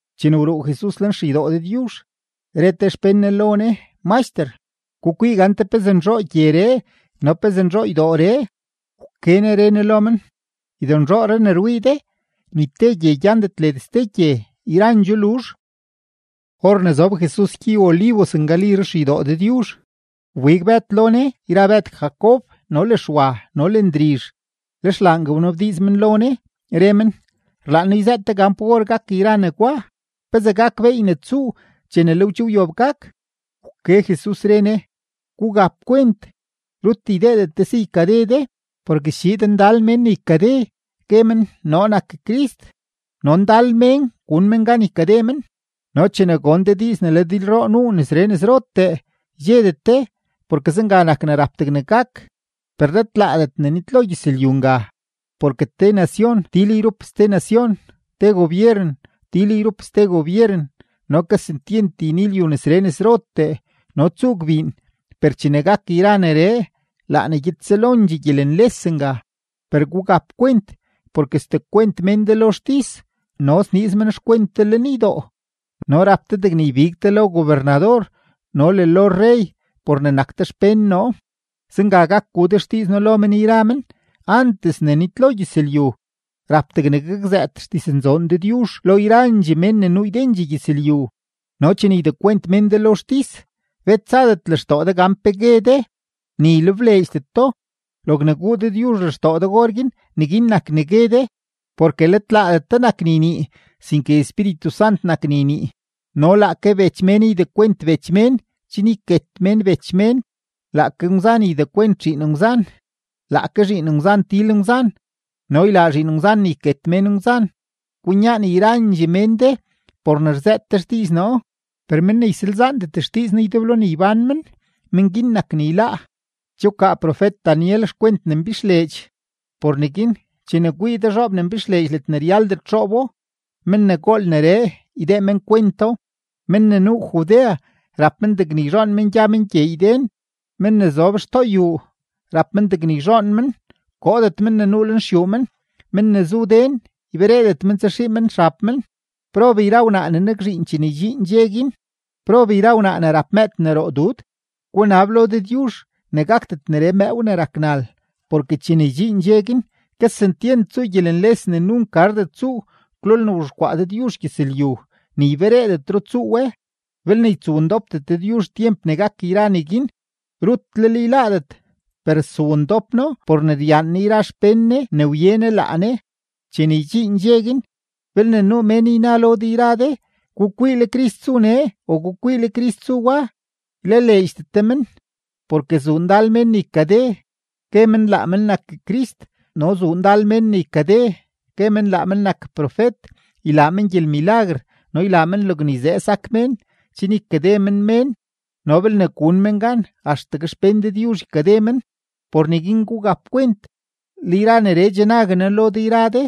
Chene wruu Jesus lenxeydoo Dëdyuzh, re te xpén Ne lo Ne: ―¡Maxter, gukwii gante pezee nzhoo gyeree no pezee nzhoo ydooree! Wke Ne re Ne lo men: ―Ydonzhooree ne rwii de, ni te gye gyandet led ste gye, yrandxoo luzh. Or ne zob Jesus gyey-Olivos ngali ruxeydoo Dëdyuzh, wbig Bëd lo Ne yra Bëd Jacob, no le Xwa, no le Ndrizh, lex laangue wnabdiiz men lo Ne, re men: ―Rlaan noo yzëët de gan pa or gak yra negwa. ¿Pezee gak beey ne tsuu chene le we che wyob gak? Wke Jesus, re Ne: ―Gugap kwent, rut ydeedet de si ykade de. Porke schiid ndal mén ne ykade, gue men: “Noo nak Crist”; no ndal mén gun men gan ykade men. ’No chene gon de diiz ne le dilroo nuu nesree nesrotee, ydxedet de, porke zenga nak ne rap degne gak; per let laadet ne nitlo gyëzlyu nga. Porke te nacion til yrup ste nacion, te gobyeren til yrup ste gobyeren, no kesentyent yni lyu nesree nesrotee, no tsuu gbiin. Per chene gak yra neree, laa ne gyed selondxee gyelenles nga. ’Per gugap kwent porke sdekwent mén de lo xtis, no sniiz men xkwent de lenydoo, no rap de degne ybig de lo gobernador no le lo rrey por ne nak de xpén noo. Zenga gak gu de xdiiz noo lo men yra men. Antes ne nitlo gyëzlyu, rap degne gakzëët xdiznzoon Dëdyuzh lo yrandxee mén ne nuu ydendxee gyëzlyu. No chene ydekwent mén de lo xtis, bet tsadet lextoo de gan pe gue de, ni ylebleedxdet do. Logne guu Dëdyuzh lextoo de orguin, neguin nak ne gue de, porke let laadet de nak ne ynii, sinke Espíritu Sant nak ne ynii. No laake bech mén ydekwent bech mén chen yket mén bech men, laake ngwzan ydekwent zhiin ngwzan, laake zhiin ngwzan til ngwzan no ylaa zhiin ngwzan ne yket mén ngwzan. Kwinyaan yrandxee mén de por ne rzëët de xdiiz noo, per men ne ysalzaandet xdiiz noo ydeblo ne ybán men, men guin nak ne yláá. ’Che wkaa profet-Daniel xkwent ne mbixleedx; por neguin chene kwii de zhoob ne mbixleedx ledne ryaldet xoobo (men ne gool neree, ydee men kwento), men ne nuu Judea rap men degne yzhoon men gya men gyeey den. Men ne zob xtoo xyuu rap men degne yzhoon men, koodet men ne nuu lenxyuu men; men ne zu den ybereedet men tsaxii men xab men. ¡Prob yra wnaa ne nakzhiin chene ydxiin dxe guin! ¡Prob yra wnaa ne rap mëëd ne roo dud! Gunab lo Dëdyuzh ne gakdet neree mëëw ne rak nal. Porke chene ydxiin dxe guin, kesentyent tsuu gyelenles ne nunk gardet tsuu kwlolne wzhexkwaa Dëdyuzh gyëzlyu, ni ybereedetro tsuu we. Belne ytsowndopdet Dëdyuzh tyemp ne gak yra neguin, rutlel yláádet; per stsowndop No por ne ryaan Ne yra xpén Ne ne wye Ne laa Ne. ’Chene ydxiin dxe guin, belne nuu mén yna lo de yra de: “Gukwii, le Crist zu nee”, o “Gukwii, le Crist zu wa”, ylaleedxdet de men. Porke zuu ndal mén ne ykade, gue men laa men nak Crist, no zuu ndal mén ne ykade, gue men laa men nak profet; ylaa men gyelmilaguer no ylaa men logne yzee sak mén, chen ykade men mén no belne gun men gan, axtegue xpén Dëdyuzh ykade men. ¡Por neguin gugap kwent! Le yra neree che nague noo lo de yra de.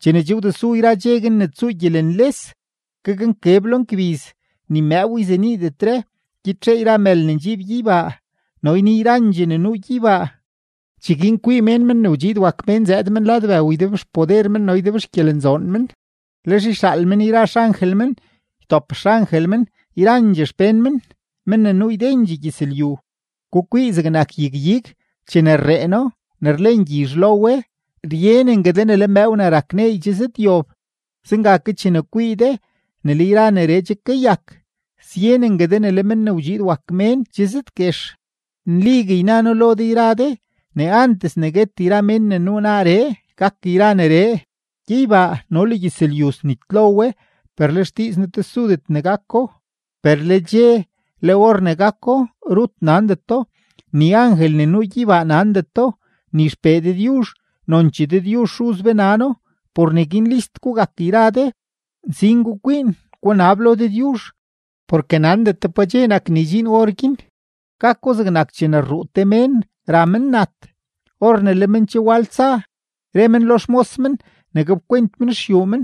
’Chene che wdesu yra dxe guin ne tsuu gyelenles, gaknkeb lo ngbiz, ni mëëw yzeniidetre, gyitxee yra mël ne ndxiib gyeybaa, no yni yrandxee ne nuu gyeybaa. Cheguin kwii mén Men ne wdxiid wak Mén zëëd men lad bëw ydebxpoder men no ydebxgyelenzoon men. Lex yxaal men yra xangel men ytop xangel men yrandxee xpén men, men ne nuu ydendxee gyëzlyu. ’Gukwii zegnak yag-ig: Chene rreeno ne rlen gyizh lo we, ryenengue de ne le mëëw ne rak neey che zëdyob. Zenga ke chene kwii de ne le yra neree che kayak, syenengue de ne le Men ne wdxiid wak Mén che zëdguex. Nligue yna noo lo de yra de ne antes ne guet yra mén ne nuu naaree, gak yra neree. Gyeybaa no le gyëzlyu snitlo we, per le xdiiz noo tesudet ne gako. ’Per le dxe, le or ne gako, rut nandeto, ni angel ne nuu gyeybaa nandeto, ni XPee Dëdyuzh. Nonchee Dëdyuzh Xuz be nano. ’Por neguin list gugak yra de, nsin gukwiin, gunab lo Dëdyuzh, porke nandet de pa dxe nak ne ydxiin orguin. Gako zegnak chene rruu te mén ra men nat. Or ne le men che wal tsa, re men lo xmos men ne gapkwent men xyuu men.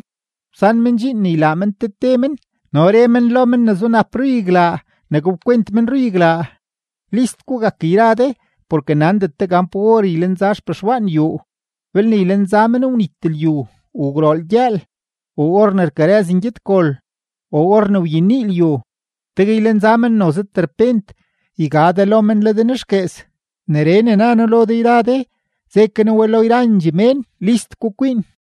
Wsan men dxiin ne ylaa men te te men, no re men lo men ne zunap ruyaglaa ne gapkwent men ruyaglaa. List gugak yra de, porke nandet de gan pa or ylenza xpexwaan yuu, belne ylenza men wnit lyu, o gwrool gyëël, o or ne rkarëz ngyedgol, o or ne wyenii lyu. Tegue ylenza men noze terpent, yga de lo men le de nexguees. Neree ne na noo lo de yra de, ze ke noo we lo yrandxee mén: ¡List gukwiin!